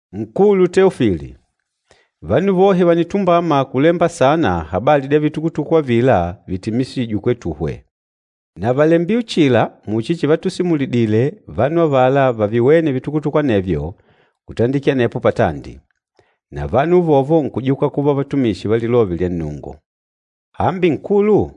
Nkulu Teofili, Vanu vohe vànitumbama kulemba saana habali dya vitukutuku avila vitimiswîje kwetuhwe. Na vàlembile uchila muchi chivatusimulidile vanu avala vaviwêne vitukutuku anevyo kutandikila anepo patandi, na vanu uvovo nkujuka kuva vatumishi va Lilove lya Nnungu. Hambi Nkulu,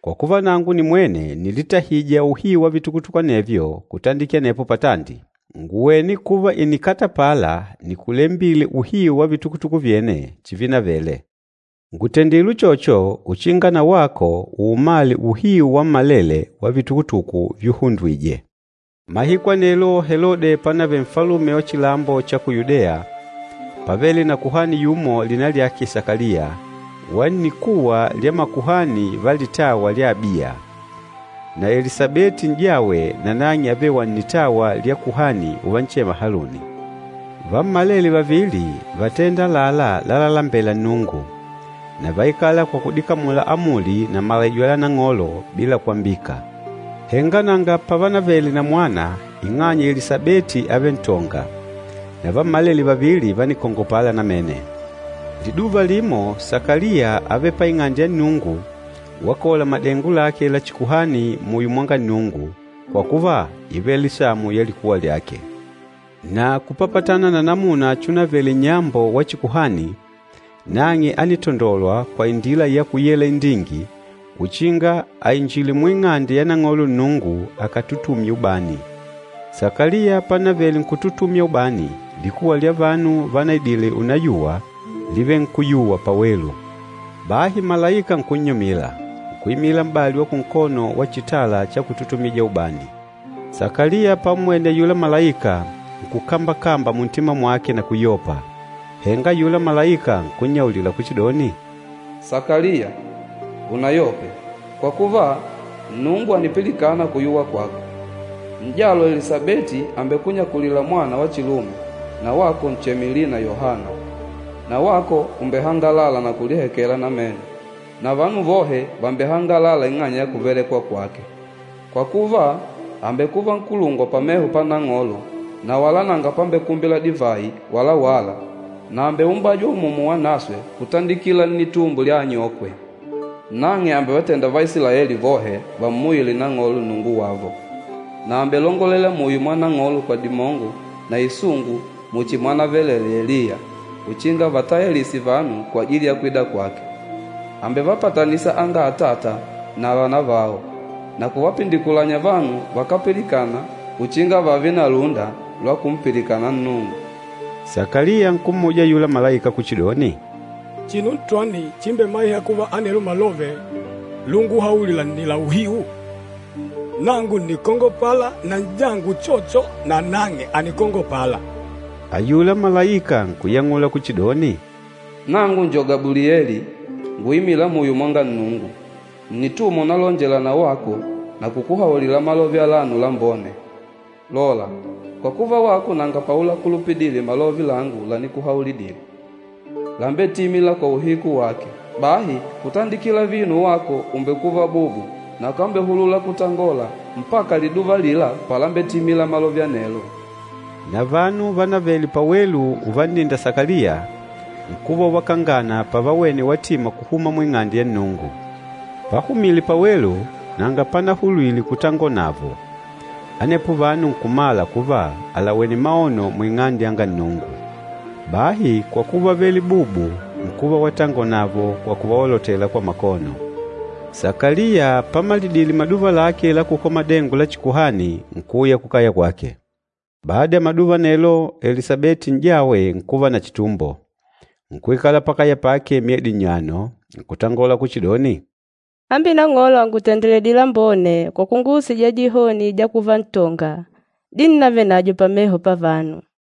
kwa kuva nangu nimwene ǹnilitahija uhiu wa vitukutuku anevyo kutandikila anepo patandi, ngùwene kuva ìnikatapala nikulembile uhiu wa vitukutuku vyene chivinavele. Ngùtendile uchocho uchinga na wako uumale uhiu wammalele wa vitukutuku vyuhundwije. Mahiku anelo Helode pánavele nfalume wa chilambo cha ku Yudeya, pávele na kuhani yumo lina lyake Sakaliya, wa nnikuwa lya makuhani va litawa lya Abiya. Na Elisabeti n'jawe nanang'e ávele wa nnitawa lya kuhani uvanchema Haluni. Vammalele vavili vátenda àlalá lalalembela Nnungu, na váikala kwa kudikamula amuli na malaijo la Nang'olo bila kwambika. Henga nanga pavanavele na mwana ing'anya Elisabeti ávele ntonga, na vammalele vavili vánikongopala namene. Liduva limo, Sakaliya ávele pa Ing'ande ya Nnungu wakola madengo lake la chikuhani muyo mwanga Nnungu, kwa kuva, ívele samu ya likuwa lyake. Na kupapatana na namuna chunavele nnyambo wa chikuhani, nang'e ánitandolwa kwa indila ya kuyela indingi uchinga ainjile mu Ing'ande ya Nang'olo Nnungu akatutumye ubani. Sakaliya panavele nkututumya ubani, likuwa lya vanu vanaidile unayuwa, lívele nkuyuwa pawelu. Bahi malaika nkunnyumila, nkuimila m'bali wa kunkono wa chitala cha kututumija ubani. Sakaliya pammwene ayula malaika nkukambakamba muntima mwake na kuyopa. Henga ayula malaika nkunnyaulila kuchidoni, “Sakaliya, unayope, kwa kuva Nnungu ànipilikana kuyuwa kwako. N'jalo Elisabeti àmbekunyakulila mwana wa chilume, na wako ncheme lina Yohana. Na wako ùmbehangalala na kulihekela namene, na vanu vohe vàmbehangalala ing'anya ya kuvelekwa kwake. Kwa kuva, àmbekuva nkulungwa pameho pa Nang'olo na wala nanga pambekumbila divayi wala wâla, na àmbeumbajwa Umumu Wanaswe kutandikila nnitumbo lya anyokwe. Nang'e àmbevatenda Vaisilaeli vohe vammuyile Nang'olo Nnungu wavo. Na àmbelongolela muyo mwa Nang'olo kwa dimongo na isungu muchi mwanavelelee Eliya uchinga avatayalise vanu kwajili ya kwida kwake. Àmbevapatanisa anga atata na vanavao, na kuvapindikulanya vanu vakápilikana uchinga vààve na lúnda lwa kumpilikana Nnungu.” Sakaliya nkummuja ayula malaika kuchidoni, “Chinu ntwani chimbemaîha kuva anelo malove lunguhaulila nni la uhiu? Nangu ǹnikongopala, na n'jangu uchocho nanang'e ànikongopala.” Ayula malaika nkuyang'ula kuchidoni, “Nangu njo Gabulieli, nguimîla muyo mwanga Nnungu. Ǹnitumwa unalonjela na wako na kukuhaulila malove alano lambone. Lola, kwa kuva wako nanga paulakulupidile malove langu lanikuhaulidile, lambetimîla kwa uhiku wake, bahi kutandikila vino wako ùmbekuva bubu na ukambehulula kutangola mpaka liduva alila palambetimila malove anelo.” Na vanu vanavele pawelu uvanninda Sakaliya, nkuva uvakangana pàvawene watima kuhuma mu Ing'ande ya Nnungu. Pahumile pawelu, nanga panahulwile kutangonavo. Anepo vanu nkumala kuva àlawene maono mu Ing'ande ya Nnungu. Bahi kwa kuva ávele bubu, nkuva watangola navo kwa kuvaolotela kwa makono. Sakaliya pamalidile maduva lake la kukola madengo la chikuhani, nkuuya kukaya kwake. Bada ya maduva anelo, Elisabeti n'jawe nkuva na chitumbo, nkuikala pakaya pake myedi nnyano, nkutangola kuchidoni, “Hambi Nang'olo àngutendeledile lambone kwa kunguusija dihoni dya kuva ntonga, dinnavenadyo pameho pavanu.”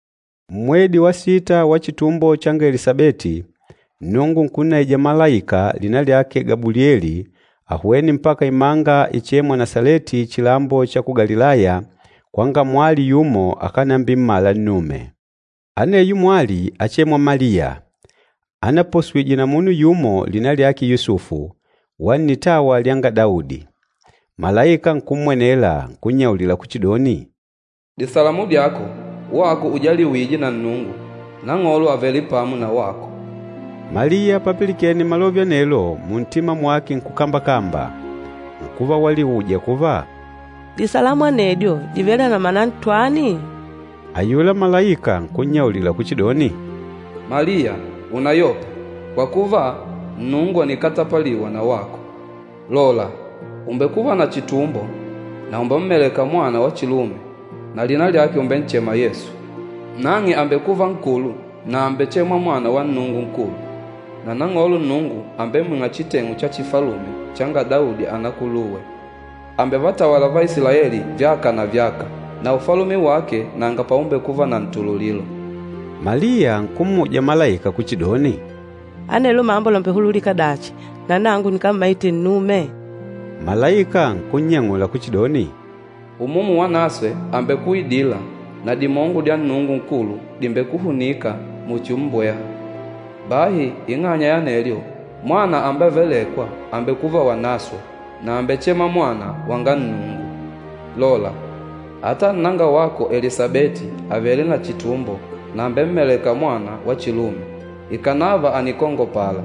Mmwedi wa sita wa chitumbo changa Elisabeti, Nnungu nkunnaija malaika lina lyake Gabulieli, ahwene mpaka imanga ichêmwa Nasaleti chilambo cha ku Galilaya, kwanga mwali yumo, akànambimmala nnume. Aneyo mwali áchemwa Maliya, anaposwije na munu yumo lina lyake Yusufu, wa nnitawa lyanga Daudi. Malaika nkummwenela, nkunnyaulila kuchidoni, “Disalamu dyako, wako ujaliwîje na Nnungu! Nang'olo àvele pamo na wako.” Maliya papilikene malove anelo muntima mwake nkukambakamba, nkuva waliuja kuva, “Disalamu anedyo dìvele na mana ntwani?” Ayula malaika nkunyaulila kuchidoni, “Maliya unayope, kwa kuva, Nnungu ànikatapaliwa na wako. Lola, ùmbekuva na chitumbo, na ùmbemmeleka mwana wa chilume, na lina lyake ùmbenchema Yesu. Nang'e àmbekuva nkulu na àmbechemwa Mwana wa Nnungu Nkulu. Na Nang'olo Nnungu àmbemwing'a chiteng'u cha chifalume changa Daudi, anakuluwe. Àmbevatawala Vaisilaeli vyaka na vyaka, na ufalume wake nanga paumbekuva na ntululilo.” Maliya nkummuja malaika kuchidoni, “Anelo mambo làmbehululika dachi, na nangu nikàmmaìtè nnume?” Malaika nkunnyang'ula kuchidoni, “Umumu Wanaswe àmbekuidila, na dimongo dya Nnungu Nkulu dìmbekuhunika muchi mmbweha. Bahi ing'anya ya anelyo, Mwana ambevelêkwa àmbekuva Wanaswe na àmbechemwa Mwana wanga Nnungu. Lola, ata nnanga wako Elisabeti àvele na chitumbo na àmbemmeleka mwana wa chilume ikànava ànikongopala.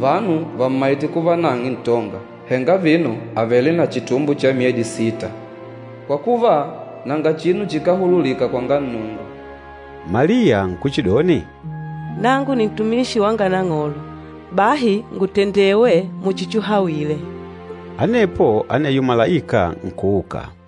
Vanu vàmmaite kuva nang'e ntonga, henga vino àvele na chitumbo cha mwedi wa sita. Kwa kuva, nanga chinu chikáhululika kwanga Nnungu.” Maliya nkuchidoni, “Nangu ni ntumishi wanga Nang'olo, bahi ngutendewe muchi chuhawile.” Anepo aneyo malaika nkuuka.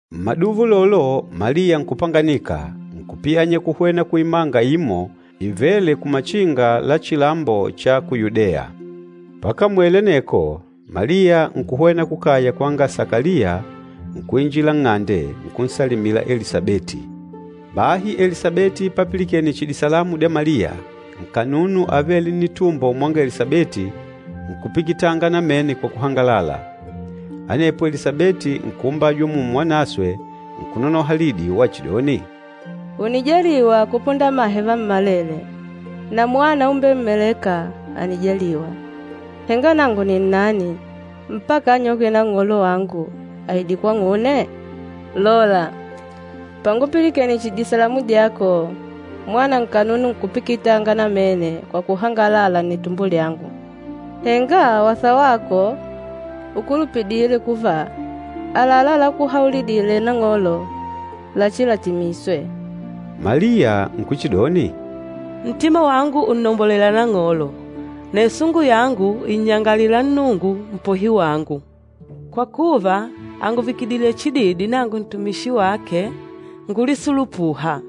Mmaduva ulolo Maliya nkupanganika, nkupiyanya kuhwena kuimanga imo ivêle kumachinga la chilambo cha ku Yudeya. Pakamwele aneko, Maliya nkuhwena kukaya kwanga Sakaliya, nkuinjila nng'ande, nkunsalimila Elisabeti. Bahi Elisabeti papilikene chihi disalamu dya Maliya, nkanunu avêle nnitumbo mwanga Elisabeti, nkupikitanga namene kwa kuhangalala. Anepo Elisabeti nkuumbajwa Umumu Wanaswe, nkunonoha lidi wachidoni, “Ùnijaliwa kupunda amahe vammalele, na mwana umbemmelêka ànijaliwa! Henga nangu ni nani mpaka anyokwe Nang'olo wangu aide kwang'une? Lola, pangupilikene chihi disalamu dyako, mwana nkanunu nkupikitanga namene kwa kuhangalala nnitumbo lyangu. Henga wasa wako ukulupidîle kuva, àlalá lákuhaulidìlè Nang'olo lachilatimiswe!” Maliya nkuchidoni, “Ntima wangu ùnnombolela Nang'olo, na isungu yangu ìnnyangalalila Nnungu Mpohi wangu. Kwa kuva, ànguvikidile chididi nangu nintumishi wake ngulisulupûha.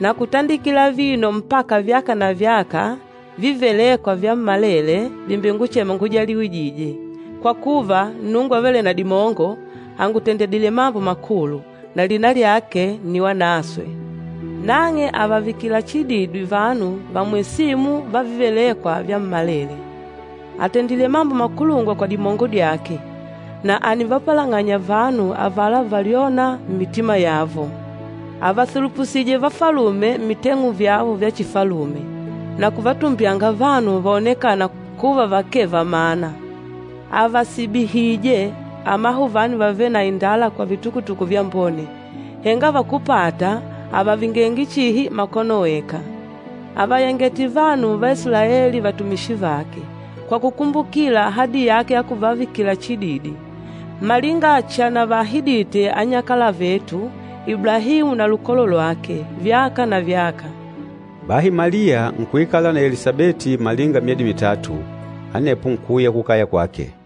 Na kutandikila vino mpaka vyaka na vyaka, vívelêkwa vyammalele vìmbenguchema ngujaliwîje, kwa kuva, Nnungu Avêle na Dimongo àngutendedile mambo makulu, na lina lyake nni wanaswe. Nang'e àvavikila chididi vanu vamwesîmu va vívelêkwa vyammalele. Àtendile mambo makulungwa kwa dimongo dyake, na ànivapalang'anya vanu avala valyôna mmitima yavo. Àvasulupusije vafalume mmiteng'u vyavo vya chifalume, na kuvatumbyanga vanu vaonekâna kuva vakee va mana. Àvasibihije amahuvani vavêle na indala kwa vitukutuku vyambone, henga vakúpata àvavingenge chihi makono weka. Àvayangete vanu va Isilaeli vatumishi vake, kwa kukumbukila ahadi yake ya kuvavikila chididi, malinga chanavaahidite anyakala vetu, Iblahimu na lukolo lwake, vyaka na vyaka!” Bahi Maliya nkuikala na Elisabeti malinga myedi mitatu, anepo nkuuya kukaya kwake.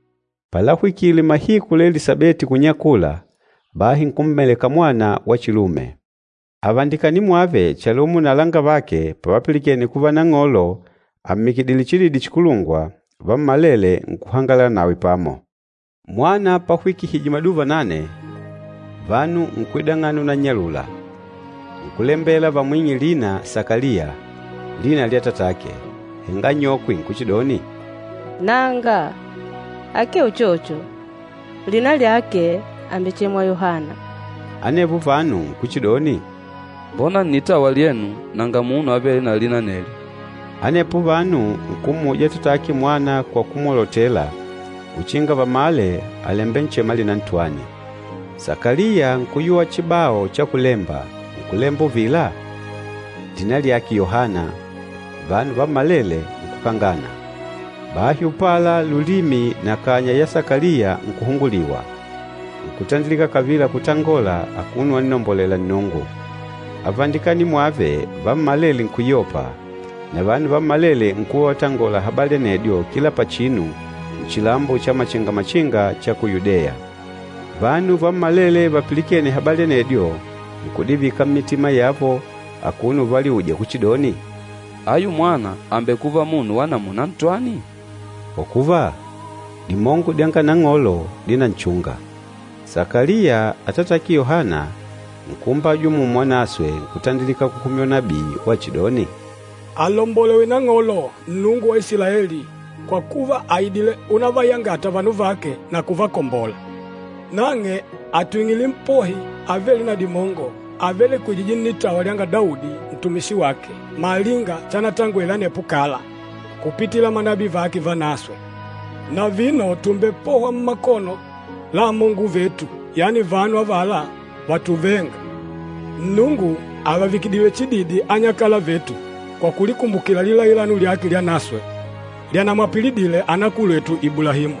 Palahwikile mahiku la Elisabeti kunyakula, bahi nkummeleka mwana wa chilume. Avandikani mwave chalumo na alangavake pavapilikene kuva Nang'olo àmmikilidile chididi chikulungwa, vammalele nkuhangalala nawe pamo. Mwana pahwikihije maduva nane, vanu nkwidang'ana unannyalula, nkulembela vamwing'e lina Sakaliya, lina lya atatake. Henga anyokwe nkuchidoni, “Nanga! Akee uchocho, lina lyake àmbechemwa Yohana.” Anevo vanu nkuchidoni, “Mbona nnitawa lyenu nanga munu avêle na lina anelyo!” Anepo vanu nkummuja atatake mwana kwa kumwolotela uchinga vamale àlembenchema lina ntwani. Sakaliya nkuyuwa chibao cha kulemba, nkulemba uvila, “Lina lyake Yohana.” Vanu vammalele nkukangana! Bahi upala lulimi na kanya ya Sakaliya nkuhunguliwa, nkutandilika kavila kutangola akuno wannombolela Nnungu. Avandikani mwave vammalele nkuyopa, na vanu vammalele nkuva uvatangola habali anedyo kila pachinu nchilambo cha machinga-machinga cha ku Yudeya. Vanu vammalele vapilikêne habali anedyo, nkudivika mmitima yavo akuno uvaliuja kuchidoni, “Ayu mwana àmbekuva munu wa namuna ntwani?” Kwa kuva, dimongo dyanga Nang'olo dínanchunga. Sakaliya, atatake Yohana, nkuumbajwa Umumu Wanaswe, nkutandilika kuhumya unabii wachidoni, “Alombolewe Nang'olo, Nnungu wa Isilaeli, kwa kuva, àidile unavayangata vanu vake na kuvakombola. Nang'e àtwing'ile Mpohi avêle na dimongo, avelekwejîje nnitawa lynga Daudi, ntumishi wake, malinga chanatangwele anepo kala, kupitila manabii vake vanaswe. Na vino tùmbepohwa mmakono la amongo vetu, yani vanu avala vatuvênga. Nnungu àvavikidile chididi anyakala vetu, kwa kulikumbukila lilailano lyake lyanaswe, lyanamwapilidile anakulwetu Iblahimu.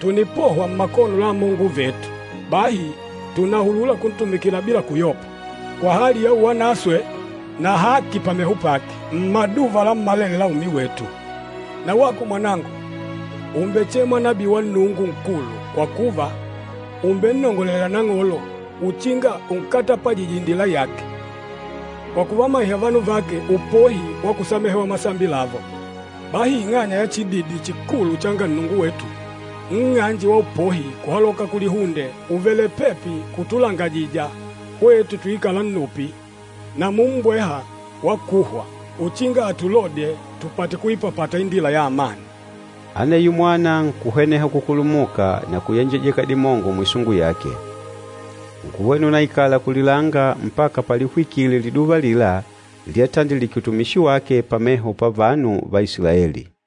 Tùnipohwa mmakono la amongo vetu, bahi tùnahulula kuntumikila bila kuyopa, kwa hali ya uwanaswe na haki pameho pake, mmaduva lammalele la umi wetu. Na wako mwanangu, ùmbechemwa nabii wa Nnungu Nkulu, kwa kuva, ùmbennongolelela Nang'olo, uchinga unkatapajije indila yake, kwa kuvamaiha vanu vake upohi wa kusamehewa masambi lavo. Bahi ing'anya ya chididi chikulu changa Nnungu wetu, nng'anje wa upohi kuhaloka kulihunde ùvele pepi kutulangajija, hwetu tuikâla nnupi na mummbweha wa kuhwa, uchinga atulodye tupate kuipapata indila ya amani.” Aneyo mwana nkuhweneha kukulumuka na kuyenjejeka dimongo muisungu yake. Nkuhwena unaikala kulilanga mpaka palihwikile liduva alila lyatandilike utumishi wake pameho pa vanu va Isilaeli.